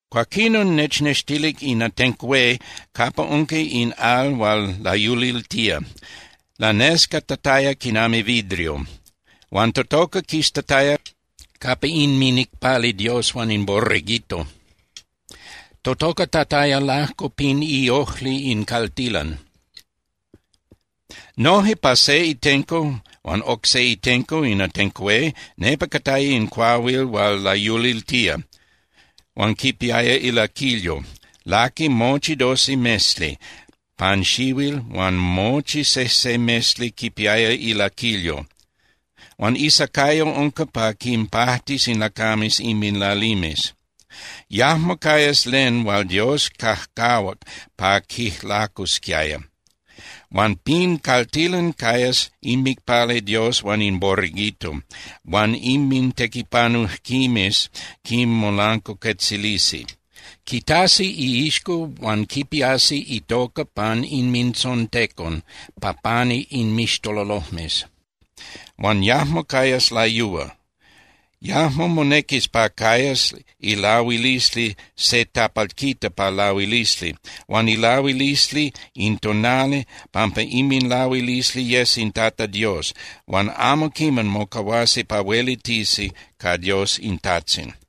Cuaquinon nechnextilic in atenco hué capa unca in al hual layuliltía, lanescatataya quinami vidrio, huan totoca quistataya capa inminicpali Dios huan in Borreguito. Totocatataya lajco pin iojli in caltilan. Noje pa se itenco huan oc se itenco in atenco hué nepa cataya in cuahuil hual layuliltía, huan quipiaya ilaquilyo. Laqui mochi doce mesli pan xihuil huan mochi sejse mesli quipiaya ilaquilyo. Huan isacayo unca pa quinpajtis in lacames inminlalimes. Yajmo cayas len hual Dios cajcajuac pa quijlacusquiaya. Huan pin caltilan cayas inmicpali Dios huan in Borreguito, huan inmintequipanujquimes quinmolancuacuetzilisi. Quitasi iixco huan quipiasi itoca pan inmintzontecon pa pani inmixtololojmes. Huan yajmo cayas layúa. Yajmo monequis pa cayas ilahuilisli se tapalquita pa lahuilisli, huan ilahuilisli in tonali, pampa inminlahuilisli yes in Tata Dios. Huan amo quiman mocahuasi pa huelitisi ca Dios in Tajtzin.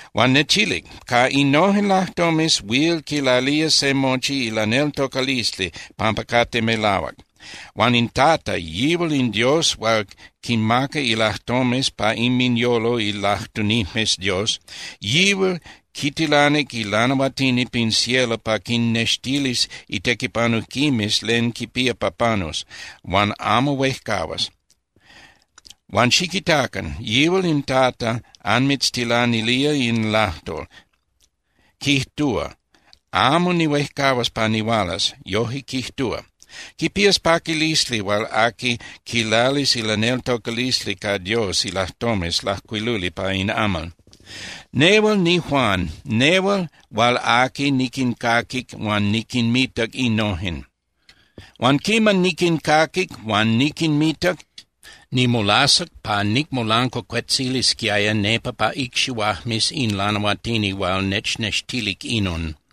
Huan nechilic: —Ca innojen lajtomes huil quilalía se mochi ilaneltocalisli pampa cate melahuac. Huan in Tata, yihual in Dios hual quinmaca ilajtomes pa inminyolo ilajtunijmes Dios, yihual quitilanic ilanahuatini pin cielo pa quinnextilis itequipanujquimes len quipía pa panus, huan amo huejcahuas. Huan xiquitacan, yihual in Tata anmitztilanilía in lajtol, quijtúa: “Amo nihuejcahuas pa nihualas.” Yoje quijtúa. ¡Quipías paquilisli hual aqui quilalis ilaneltocalisli ca Dios ilajtomes lajcuiluli pa in amal! Nehual niJuan, nehual hual aqui niquincaquic huan niquinmitac innojen. Huan quiman niquincaquic huan niquinmitac, nimolasac pa nicmolancuacuetzilisquiaya nepa pa icxihuajmes in lanahuatini hual nechnextilic inon.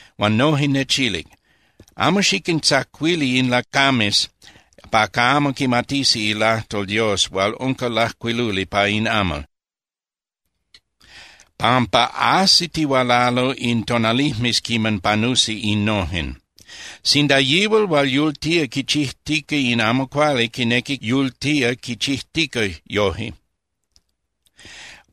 Huan noje nechilic: —Amo xiquintzacuili in lacames pa camo quimatisi ilajtol Dios hual unca lajcuiluli pa in amal, pampa ajsitihualalo in tonalijmes quiman panusi innojen. Sinda yihual hual yultía quichijtica in amo cuali quinequi yultía quichijtica yojque,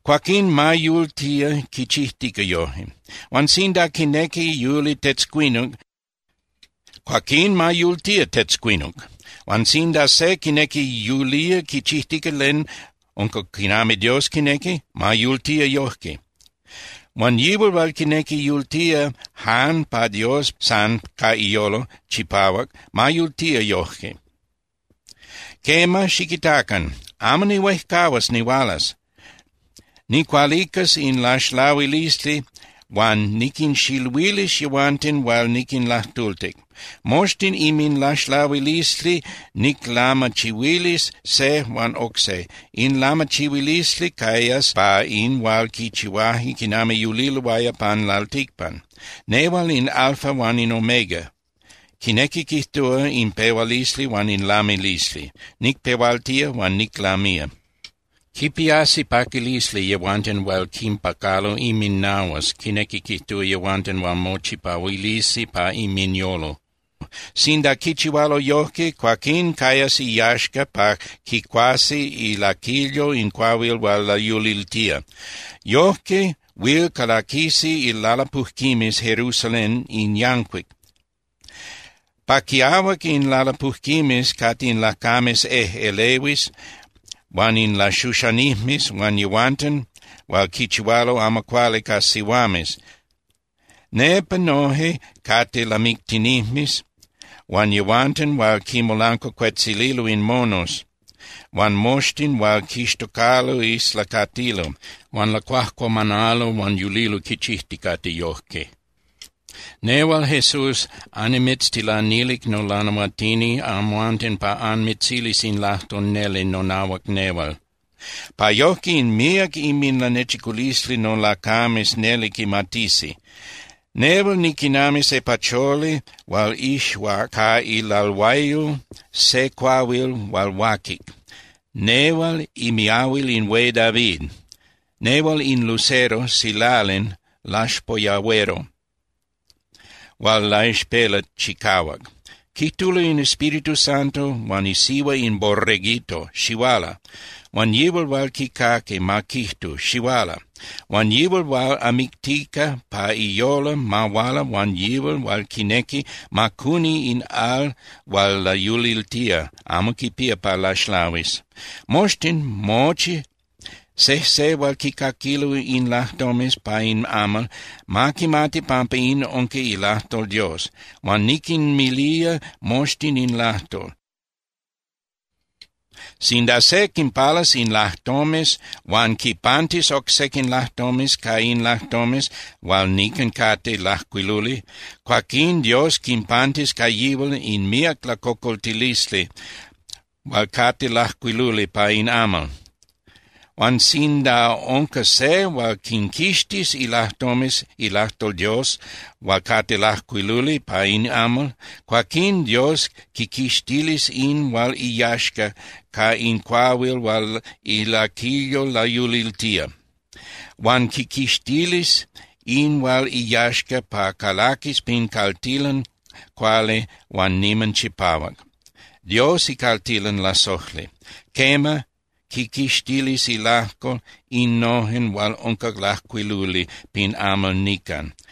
cuaquín ma yultía quichijtica yojque. Huan sinda quinequi yuli tetzcuinuc, cuaquín ma yultía tetzcuinuc. Huan sinda se quinequi yultía quichijtica len unca quinami Dios quinequi, ma yultía yojque. Huan yihual hual quinequi yultía jan pa Dios san ca iyolo chipahuac, ma yultía yojque. ’Quema, xiquitacan. Amo nihuejcahuas nihualas. Nicualicas in laxlahuilisli huan niquinxiluilis yehuanten hual niquinlajtultic. Moxtin inminlaxlahuilisli niclamachihuilis se huan oc se. In lamachihuilisli cayas pa in hual quichihuaje quiman yuliloaya pan lalticpan. Nehual in Alfa huan in Omega, quinequi quijtúa in pehualisli huan in lamilisli. Nicpehualtía huan niclamía. Quipiasi paquilisli yehuanten hual quinpacalo inminahuas, quinequi quijtúa, yehuanten hual mochipahuilisi pa inminyolo. Sinda quichihualo yojque, cuaquín cayas iyaxca pa quicuasi ilaquilyo in cuahuil hual layuliltía. Yojque huil calaquisi ilalapujquimes Jerusalén in yancuic. Pa quiahuac in lalapujquimes cate in lacames ejꞌelehuis huan in laxuxanijmes huan yehuanten hual quichihualo amo cuali ca sihuames. Nepa noje cate lamictinijmes huan yehuanten hual quinmolancuacuetzililo in monos huan moxtin hual quixtocalo islacatilo huan lacuajcuamanalo huan yulilo quichijticate yojque. —Nehual Jesús annimitztilanilic nolanahuatini amhuanten pa anmitzilis in lajtol neli nonahuac nehual, pa yojque in míac inminlanechiculisli nolacames neli quimatisi. Nehual niquinami se pacholi hual ixuac ca ilalhuayol se cuahuil hual huaquic, nehual imiahuil in hué David. Nehual in lucero (silalin) laxpoyahuero hual laixpela chicahuac. Quijtulo in Espíritu Santo huan isihua in Borreguito: —Xihuala. Huan yihual hual quicaqui, ma quijtu: —Xihuala. Huan yihual hual amictica pa iyolo ma huala huan yihual hual quinequi, ma cuni in al hual layuliltía, amo quipía pa laxlahuis. Moxtin, mochi sejse hual quicaquilo in lajtomes pa in amal, ma quimati pampa in unca ilajtol Dios. Huan niquinmilía moxtin in lajtol: Sinda se quinpalas in lajtomes huan quipantis oc sequin lajtomes ca in lajtomes hual nican cate lajcuiluli, cuaquín Dios quipantis ca yihual in míac lacocoltilisli hual cate lajcuiluli pa in amal. Huan sinda unca se hual quinquixtis ilajtomes ilajtol Dios hual cate lajcuiluli pa in amal, cuaquín Dios quiquixtilis in hual iyaxca ca in cuahuil hual ilaquilyo layuliltía, huan quiquixtilis in hual iyaxca pa calaquis pin caltilan cuali huan niman chipahuac, Dios icaltilan lasojli. Quema, quiquixtilis ilajco innojen hual unca lajcuiluli pin amal nican.